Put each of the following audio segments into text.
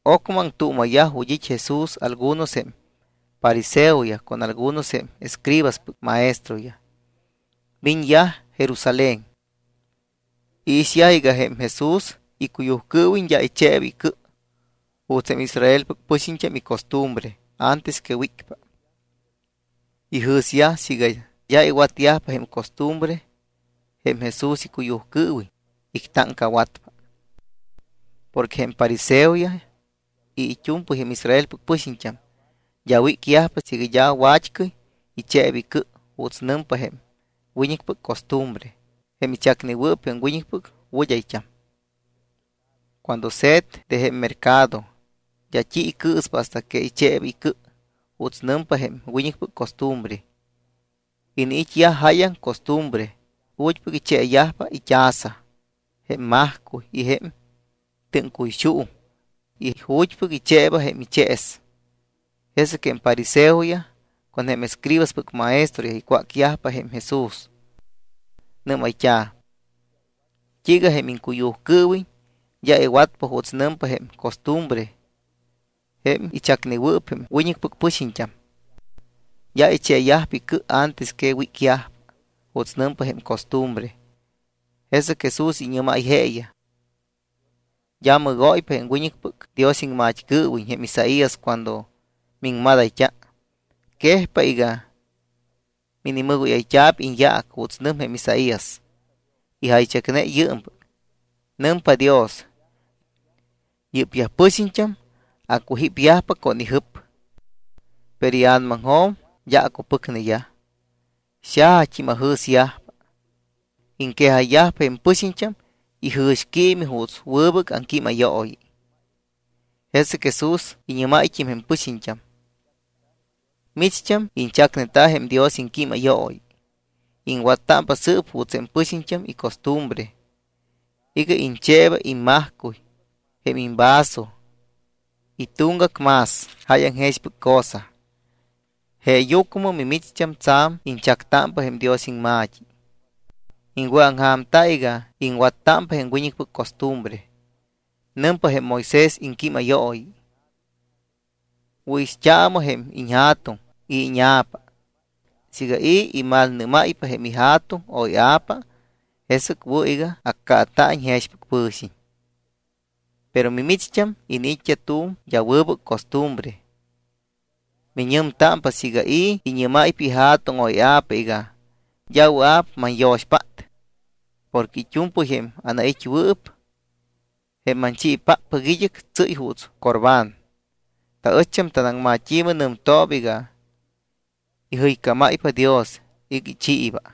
Ocmɨ aŋtuuma̱yaj ju̱t́ it́ Jesús algunos jém fariseoyaj con algunos jém escribaspɨc maestroyaj. Miñyaj Jerusalén. Iixyaj iga jém Jesús icuyujcɨɨwiñ d́a icheeyajpa icɨ juuts jém Israelpɨc pɨxiñt́am icostumbre antes que wícpa. Ijɨ̱syaj siiga d́a iwatyajpa jém costumbre jém Jesús icuyujcɨɨwiñ, ictáŋcawatpa. Porque jém fariseoyaj y it́u̱mpɨy jém Israelpɨc pɨxiñt́am d́a wícyajpa siiga d́a wat́cɨy icheeba icɨ juuts nɨm jém wiñɨcpɨc costumbre, jém ichacnewɨɨp jém wiñɨcpɨc wɨd́ayt́am. Cuando se̱t de jém mercado, d́a t́i icɨɨspa hasta que icheeba icɨ juuts nɨmpa jém wiñɨcpɨc costumbre. Iniit́yaj jáyaŋ costumbre ju̱t́pɨc icheeyajpa it́aza, jém majcuy y jém tɨ́ŋcuyxuuŋ y ju̱t́pɨc icheeba jém ichees. Jesɨc jém fariseoyaj con jém escribaspɨc maestroyaj icwácyajpa jém Jesús. Nɨ́mayt́a̱: —¿T́iiga jém iŋcuyujcɨɨwiñ d́a iwatyajpa juuts nɨmpa jém costumbre jém ichacnewɨɨp jém wiñɨcpɨc pɨxiñt́am? D́a icheeyajpa icɨ antes que wícyajpa juuts nɨmpa jém costumbre. Jesɨc Jesús iñɨ́máy jeeyaj: —D́a mɨgóypa jém wiñɨcpɨc Dios iŋmat́cɨɨwiñ jém Isaías cuando miŋmadayt́a. Quejpa iga minimɨgóyayt́a̱p iñyaac juuts nɨm jém Isaías. Ijaychacne yɨɨmpɨc: Nɨmpa Dios: Yɨ́pyaj pɨxiñt́am acujípyajpa con ijɨp. Pero ia̱namaŋjo̱m d́a acupɨcneyaj. Xajat́im ajɨ̱syajpa. Iŋquejayyajpa jém pɨxiñt́am ijɨ̱xquiimi juuts wɨbɨc aŋquímayooyi. Jesɨc Jesús iñɨ́máyt́im jém pɨxiñt́am: —Micht́am iñchacneta jém Dios iŋquímayooyi. Iŋwattámpa sɨɨp juuts jém pɨxiñt́am icostumbre iga iñcheeba immajcuy, jém imvaso, y tuŋgac más jáyaŋ jexpɨc cosa. Jeeyucmɨ mimicht́am tsa̱m iñchactámpa jém Dios iŋma̱t́i. Iŋwɨ̱aŋja̱mta iga iŋwattámpa jém wiñɨcpɨc costumbre. Nɨmpa jém Moisés iŋquímayooyi: “Wɨ̱ixt́aamɨ jém iñja̱tuŋ y íña̱pa. Siiga i̱ imalnɨ́máypa jém ija̱tuŋ o ia̱pa, jesɨc wɨ̱ iga accaata̱iñ jexpɨc pɨ̱xiñ.” Pero mimicht́am iniit́t́a tu̱m d́a wɨbɨc costumbre. Miñɨmtámpa siiga i̱ iñɨ́máypa ija̱tuŋ o ia̱pa iga: “D́a wɨa̱p manyo̱xpát porque it́u̱mpɨy jém anait́wɨɨp, jém manchiipáppɨc id́ɨc, tsɨ́y juuts Corbán.” (Taɨcht́am tanaŋmat́i̱mɨ nɨmtooba iga ijɨycámáypa Dios iga ichiiba.)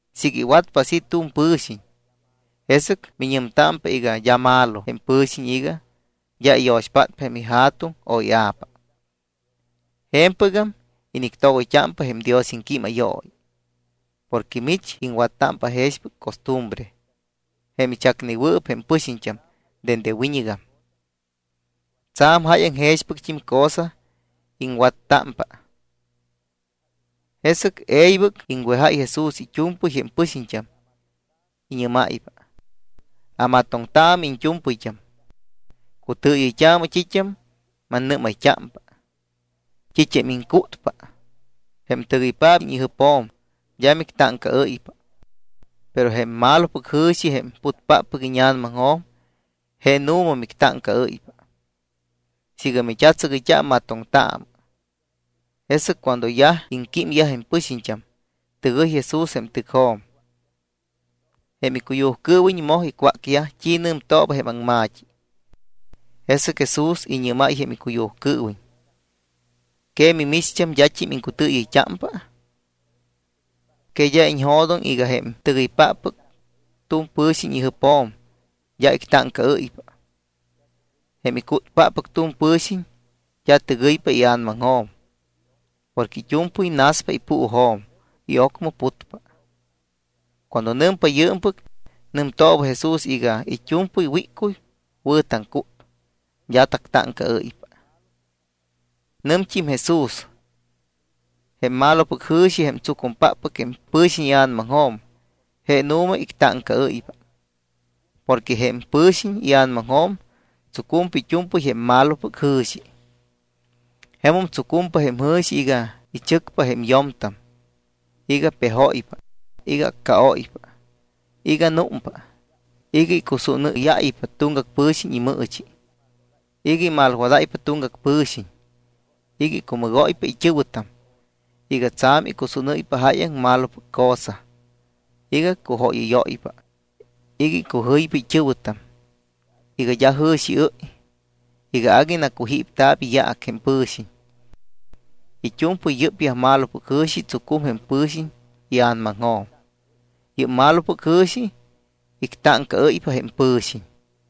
Siiga iwatpa así tu̱m pɨ̱xiñ, jesɨc miñɨmtámpa iga d́a malo jém pɨ̱xiñ iga d́a iyo̱xpátpa jém ija̱tuŋ o ia̱pa. Je̱mpɨgam inictogoyt́ámpa jém Dios iŋquímayooyi porque mich iŋwattámpa jexpɨc costumbre, jém ichacnewɨɨp jém pɨxiñt́am dende wiñɨgam. Tsa̱m jáyaŋ jexpɨct́im cosa iŋwattámpa. Jesɨc e̱ybɨc iŋwejáy Jesús it́u̱mpɨy jém pɨxiñt́am. Iñɨ́máypa: —Amatoŋtaamɨ iñt́u̱mpɨyt́am. Cutɨɨyɨyt́aamɨ t́it́am mannɨ́mayt́ámpa. T́it́am iŋcútpa, jém tɨgɨypaap iñjɨpjo̱m, d́a mictáŋcaɨ́ypa. Pero jém malopɨc jɨ̱xi, jém putpáppɨc íña̱namaŋjo̱m, je nu̱ma mictáŋcaɨ́ypa. Siiga mit́atsɨgɨyt́a, amatoŋtaamɨ. Jesɨc cuando yaj iŋquímyaj jém pɨxiñt́am, tɨgɨy Jesús jém tɨcjo̱m. Jém icuyujcɨɨwiñ moj icwácyaj t́i nɨmtooba jém aŋma̱t́i. Jesɨc Jesús iñɨ́máy jém icuyujcɨɨwiñ: —¿Que mimicht́am d́at́im iŋcutɨɨyɨyt́ámpa? Que d́a iñjo̱doŋ iga jém tɨgɨypáppɨc tu̱m pɨ̱xiñ ijɨpjo̱m d́a ictáŋcaɨ́ypa. Jém icútpáppɨc tu̱m pɨ̱xiñ d́a tɨgɨypa ia̱namaŋjo̱m porque it́u̱mpɨy naspa ipuujo̱m y ocmɨ putpa. Cuando nɨmpa yɨɨmpɨc, nɨmtooba Jesús iga it́u̱mpɨy wíccuy wɨ̱ taŋcút, d́a tactáŋcaɨ́ypa. Nɨmt́im Jesús: —Jém malopɨc jɨ̱xi jém tsucumpáppɨc jém pɨ̱xiñ ia̱namaŋjo̱m je nu̱ma ictáŋcaɨ́ypa. Porque jém pɨ̱xiñ ia̱namaŋjo̱m tsucumpa it́u̱mpɨy jém malopɨc jɨ̱xi. Jemum tsucumpa jém jɨ̱xi iga ichɨcpa jém yo̱mtam, iga pejóypa, iga accaóypa, iga númpa, iga icusúnɨ́yáypa tuŋgac pɨ̱xiñ imɨɨchi, iga imalwadáypa tuŋgac pɨ̱xiñ, iga icumɨgóypa it́ɨ̱wɨtam, iga tsa̱m icusúnɨ́ypa jáyaŋ malopɨc cosa, iga cujóyɨ́yóypa, iga icujɨypa it́ɨ̱wɨtam, iga d́a jɨ̱xiɨ́y, iga agui nacujípta̱p iyaac jém pɨ̱xiñ. It́u̱mpɨy yɨ́pyaj malopɨc jɨ̱xi tsucum jém pɨ̱xiñ ia̱namaŋjo̱m. Yɨ́p malopɨc jɨ̱xi ictáŋcaɨ́ypa jém pɨ̱xiñ.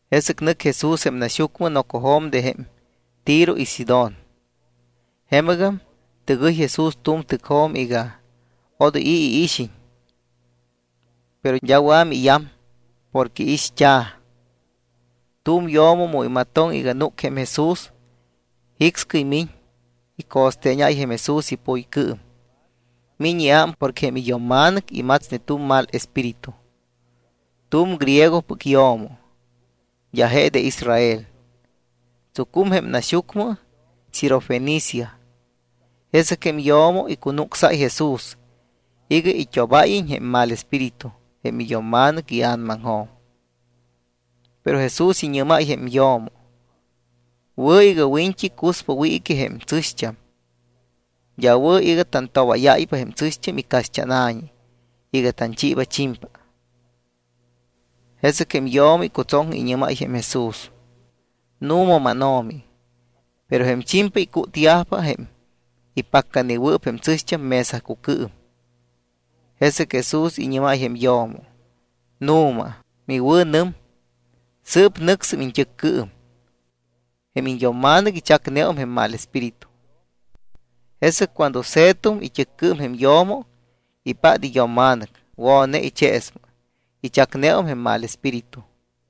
Jesɨc nɨc Jesús jém naxyucmɨ nocojo̱m de jém Tiro y Sidón. Jemɨgam tɨgɨy Jesús tu̱m tɨcjo̱m iga odoy i̱ iixiñ. Pero d́a wɨa̱ miiyam porque ixt́a̱. Tu̱m yo̱mo mu imatoŋ iga núc jém Jesús, jicscɨy miñ, ico̱steeñáy jém Jesús ipuycɨɨm. Miñ iám porque jém iyo̱mma̱nɨc imatsne tu̱m mal espíritu. Tu̱m griegopɨc yo̱mo, d́a je de Israel. Tsucum jém naxyucmɨ Sirofenicia. Jesɨc jém yo̱mo icunucsáy Jesús iga it́obáyiñ jém mal espíritu jém iyo̱mma̱nɨc ia̱namaŋjo̱m. Pero Jesús iñɨ́máy jém yo̱mo: —Wɨ̱ iga wiñt́i cuspa wiiquiyaj jém tsɨ̱xt́am. D́a wɨ̱ iga tantobáyáypa jém tsɨ̱xt́am icaxt́ána̱ñi iga tanchiiba chimpa. Jesɨc jém yo̱mo icutsoŋ, iñɨ́máy jém Jesús: —Nu̱ma, mánO̱mi, pero jém chimpa icútyajpa jém ipaccanewɨɨp jém tsɨ̱xt́am mesacucɨɨm. Jesɨc Jesús iñɨ́máy jém yo̱mo: —Nu̱ma miwɨ̱nɨm. Sɨɨp nɨcsɨm iñt́ɨccɨɨm. Jém iñyo̱mma̱nɨc ichacum jém mal espíritu. Jesɨc cuando se̱tum it́ɨccɨɨm jém yo̱mo, ipát iyo̱mma̱nɨc wo̱ne icheesmɨ. Ichacneum jém mal espíritu.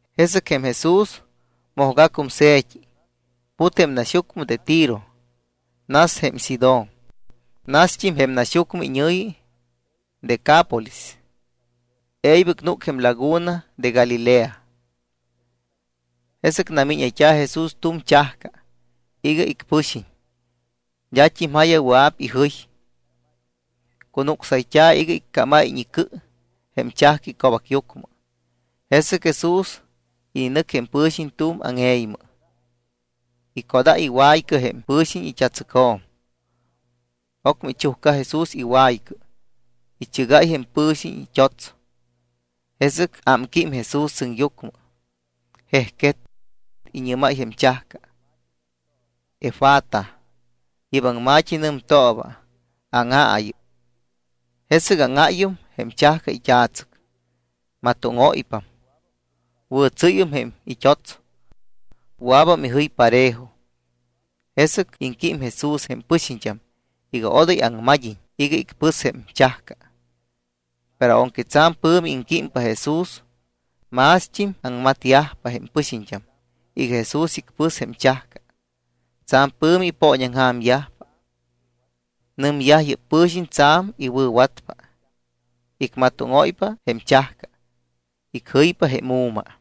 Jesɨc jém Jesús mojgacum se̱t́i, put jém naxyucmɨ de Tiro, nas jém Sidón, nast́im jém naxyucmɨ iñɨ̱yi Decápolis, e̱ybɨc núc jém laguna de Galilea. Jesɨc namíñayt́a̱ Jesús tu̱m chajca iga icpɨxiñ. D́at́im ja̱ya wɨa̱p ijɨy. Cunucsayt́a̱ iga iccámiñ icɨ jém chajca ico̱bacyucmɨ. Jesɨc Jesús ininɨc jém pɨ̱xiñ tu̱m áŋe̱ymɨ. Icodáy iwaycɨ jém pɨ̱xiñ it́a̱tsɨcjo̱m. Ocmɨ ichujca Jesús iwaycɨ, ichɨgáy jém pɨ̱xiñ it́ots. Jesɨc ámquím Jesús sɨŋyucmɨ, jejquet, iñɨ́máy jém chajca: —Efata. Yɨ́p aŋma̱t́i nɨmtooba: Áŋaayɨ. Jesɨc áŋáyum jém chajca it́a̱tsɨc. Matóŋóypam. Wɨ̱tsɨ́yñeum jém it́ots. Wɨa̱bam ijɨy parejo. Jesɨc iŋquím Jesús jém pɨxiñt́am iga odoy aŋmad́iñ iga icpɨs jém chajca. Pero aunque tsa̱m pɨ̱mi iŋquímpa Jesús, mást́im aŋmatyajpa jém pɨxiñt́am iga Jesús icpɨs jém chajca. Tsa̱m pɨ̱mi ipooñaŋja̱myajpa. Nɨmyaj: —Yɨ́p pɨ̱xiñ tsa̱m iwɨ̱watpa. Icmatóŋóypa jém chajca, icjɨypa jém u̱ma.